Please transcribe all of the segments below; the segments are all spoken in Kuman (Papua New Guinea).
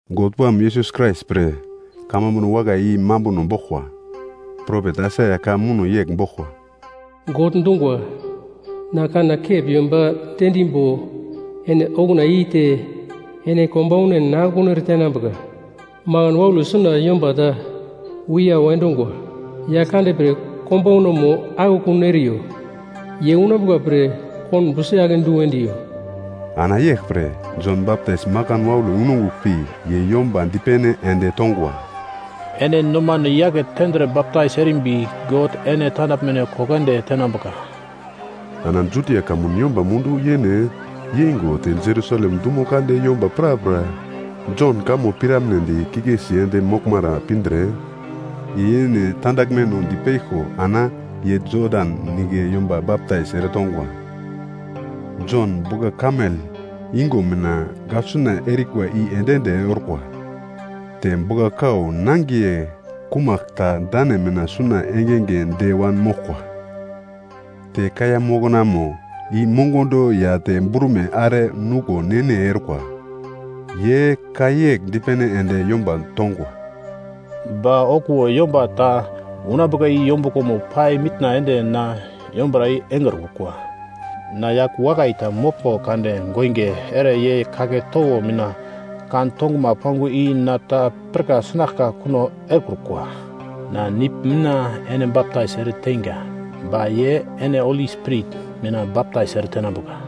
God Wam Yesus Krais pre, kamambuno wakai i mambuno boglkwa. Propet Aisaia ka muno yegl boglkwa: “God dungwa, Na kanna kep yomba diendimbo ene okuna yeite, ene konbaunan akekun eretenambuka.” “Makan waule suna yomba ta wiyau endungwa, ‘Yaglkande pre konbaunamo akekun eriyo. Ye unambuka pre konbo si-ake du endiyo.’” Ana yeglpre, Jon Baptais makan waule unongugl pi ye yomba dipene ende tongwa, “Ene nomano yake tendre baptais erimbi, God ene tandaglmeno koko ende tenambuka.” Ana Judia kamun yomba mundu-yene yeingo te Jerusalem dumo kande yomba prapra Jon kamo piramnedi kikesi ende moglmara pindre, ye yene tandaglmeno dipeglko ana ye Jodan Nigle yomba baptais eretongwa. Jon bugla-kamel yungo mina gaglsuna erikwa i ende-ende orkwa. Te bugla-kau nangiye kumagl ta dane mina suna engenge de wanmoglkwa. Te kaiya moknamo i mongondo ya te brume are nuglo ne-ne orkwa. Ye ka yegl dipene ende yomba tongwa, “Ba okuwo yomba ta unambuka i yombuglomo pai mitna ende na yombura i engrukwa. Na yagl wakai ta moglmbo kade goinge ere ye kagle towo mina kan-tonguma pangwa i na ta pirka sinaglka kuno erekrukwa. Na nigl mina ene baptais ereteinga, ba ye ene Holi Spirit mina baptais eretenambuka.”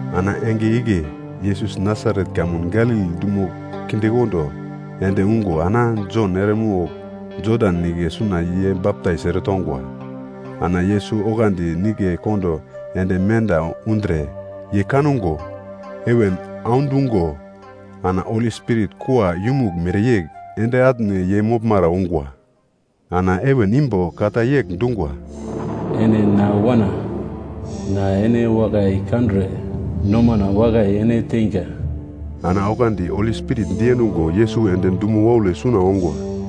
Ana enge igle Yesus Nasaret kamun Galili dumo kindekondo ende ungo ana Jon eremogl Jodan Nigle suna ye baptais eretongwa. Ana Yesus oglandi nigle kondo ende menda undre, ye kango heven audungo ana Holi Spirit kua yumugl mereyegl ende atne ye moglmara ungwa. Ana heven imbo ka ta yegl dungwa, “Ene na Wana, na ene wakai kandre nomana wakai ene teinga.” Ana oglandi Holi Spirit diendungo Yesus ende dumo waule suna ongwa.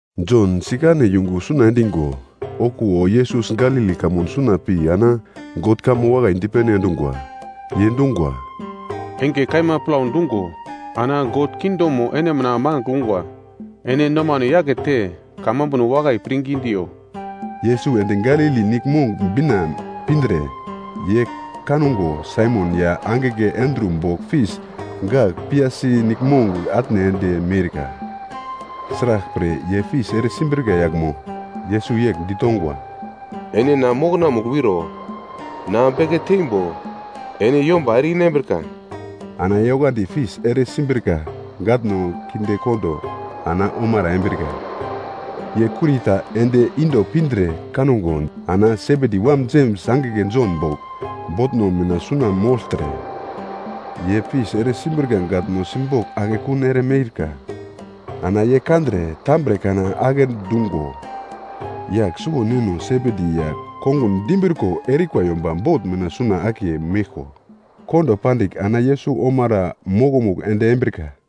Jon sikane yungu suna endigo, okuwo Yesus Galili kamun suna pi ana God kamo wakai dipene endungwa. Ye dungwa, “Enge kaima plau dungo ana God kingdomo ene mina mangigl ungwa, ene nomano yakete kamambuno wakai pirngi diyo!” Yesus ende Galili Niglmong bina pindre, ye kango Saimon ya angigle Andru bogl fis gagl piyasi niglmong atne ende miurka. Sraglpre, ye fis ere simbrika yaglmo. Yesus yegl ditongwa, “Ene na mokonamugl wiro, na beke teimbo ene yomba ere-inambrika.” Ana ye oglandi fis ere simbrika gatno kindekondo ana omara embrika. Ye kurita ende inda pindre kango, ana Sebedi wam Jems angigle Jon bogl, botno mina suna mogltre ye fis ere simbrika gatno simbogl akekun ere miurka. Ana ye kandre tambre kana agle dungo, yagl suwo neno Sebedi ya kongun di imbriko erikwa yomba bot mina suna akiye meglko kondo pandigl ana ye Yesus omara mokomugl ende embrika.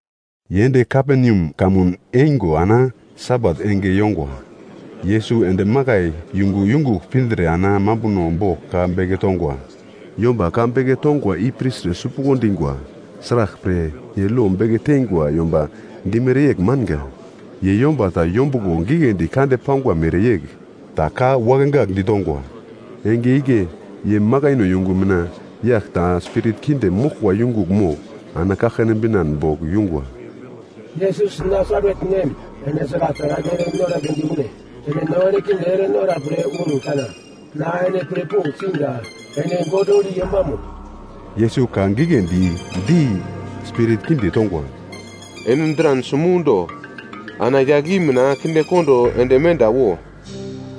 Ye ende Kaperneam kamun eingo ana Sabat enge yongwa, Yesus ende makai yungu yungugl pindre ana mambuno bogl ka beke tongwa. Yomba ka beke tongwa i pirtre sipuglo dingwa. Sraglpre, ye lo beke teingwa yomba dimere yegl manga. Ye yomba ta yombuglo gigledi kande pangwa mereyegl ta ka wakegagl ditongwa. Enge igle ye makaino yungu mina yagl ta spirit kinde moglkwa yungugl mogl ana kaglkane binan bogl yungwa. “Yesus Nasaret nem, ene sragl taragl ere noragledi une? Ene no erekinde ere nora pre un kana? Na ene pirpogl siga. Ene God Holi Yombamo!” Yesus ka giglendi di spirit kinde tongwa, “Ene dran simundo ana yagl i mina kindekondo ende menda wo!”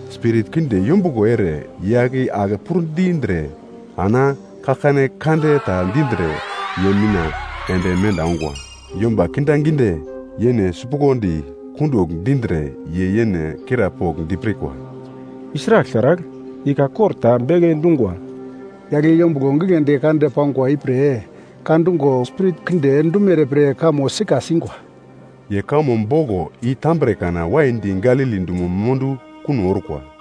Spirit kinde yombuglo ere yagl i ake pur-dindre ana kaglkane kande ta dindre ye mina ende menda ungwa. Yomba kindaginde yene sipuglodi kundugl dindre ye yene krapogl dipirkwa, “I sragl taragl? I ka kor ta beke dungwa. Yagl i yombuglo gigledi kande pangwa ipre ka dungo spirit kinde dumere pir kamo sika singwa.” Ye kamo boglo i tambre kana waidi Galili dumo mundu kuno orkwa.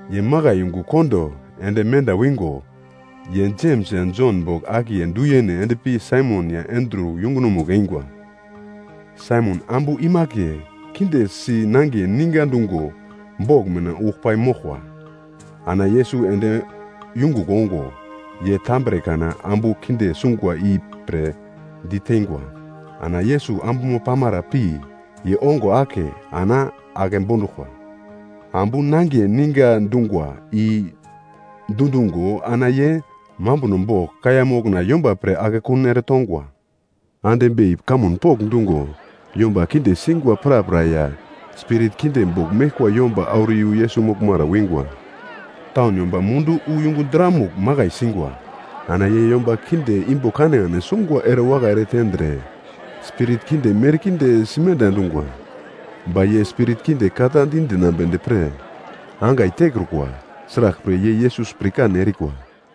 Ye makai yungu kondo ende menda wingo, ye Jems ya Jon bogl akiye du yene endpi Saimon ya Andru yungunomugl eingwa. Saimon ambu imakiye kinde si nangiye ninga dungo bogl mina ugl pai moglkwa. Ana Yesus ende yungugl ongo, ye tambre kana ambu kinde sungwa ipre diteingwa. Ana Yesus ambumo pamara pi ye ongo ake ana ake bonduglkwa. Ambu nangiye ninga dungwa i dundungo ana ye mambuno bogl kaiya mokna yomba pre akekun ere tongwa. Ande bei kamun pokndungo, yomba kinde singwa prapra ya spirit kinde bogl meglkwa yomba auro yu Yesus moglmara wingwa. Taun yomba mundu wu yungu dramugl makai singwa. Ana ye yomba kinde imbo kanekane sungwa erewakai ere tendre, spirit kinde merkinde simenda endungwa. Ba ye spirit kinde ka ta di dinaglmedi pre, angai tekrukwa. Sraglpre ye Yesus pirkan erikwa.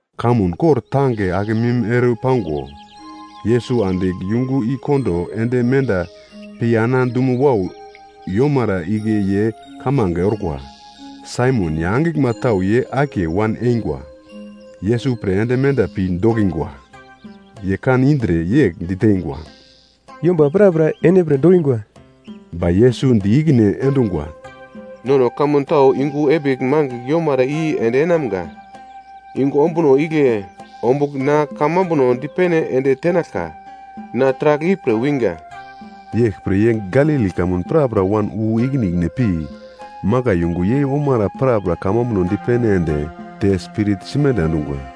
Kamun kor tange akemim ere pango, Yesus andigl yungu i kondo ende menda pi ana dumo wau yomara igle ye kamange orkwa. Saimon ya angiglma tau ye akiye wan eingwa, Yesus pre ende menda pi dokingwa. Ye kan indre yegl diteingwa, “Yomba prapra ene pre dokingwa!” Ba Yesus di ikine endungwa, “Nono kamun tau yungu epigl mangigl yomara i endeinamga. Yungu ombuno igle ombugl na kamambuno dipene ende tenaglka. Na taragl ipre winga.” Yeglpre ye Galili kamun prapra wan wu ikine ikine pi, makai yungu yei-omara prapra kamambuno dipene ende te spirit simenda endungwa.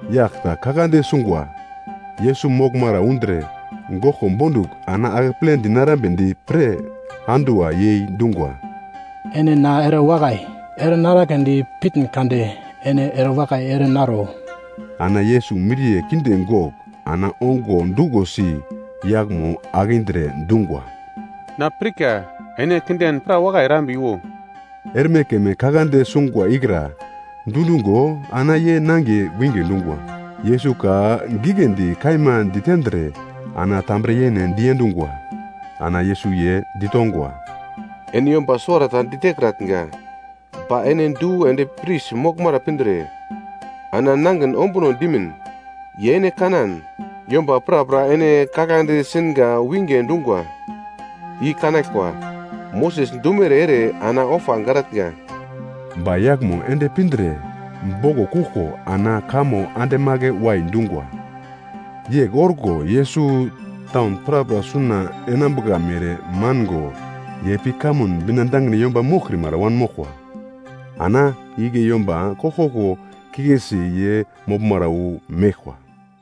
Yagl ta kaglande sungwa, Yesus moglmara undre goglko bondugl ana akeple dinarambedi pre anduwa yei dungwa, “Ene na erewakai ere naraglendi pitn kade, ene erewakai ere naro.” Ana Yesus miriye kinde gogl ana ongo duglosi yaglmo akindre dungwa, “Na pirka, ene kinden pra wakai erambiwo.” Erme keme kaglande sungwa ikra dundungo ana ye nangiye winge dungwa. Yesus ka giglendi kaima ditendre ana tambre-yene diendungwa. Ana Yesus ye ditongwa, “Ene yomba suwarata ditekratnga, ba ene du ende pris moglmara pindre ana nangin ombuno dimin. Ye ene kanan, yomba prapra ene kaglande singa winge dungwa i kanaglkwa, Moses dumere ere ana ofa garatnga.” Ba yaglmo ende pindre boglo kuglko ana kamo andemagle-wai dungwa. Yegl orko Yesus taun prapra suna enambuka mere mango ye pi kamun bina dangine yomba moglkrimara wanmoglkwa. Ana igle yomba koglkoglo kikesi ye moglmara wu meglkwa.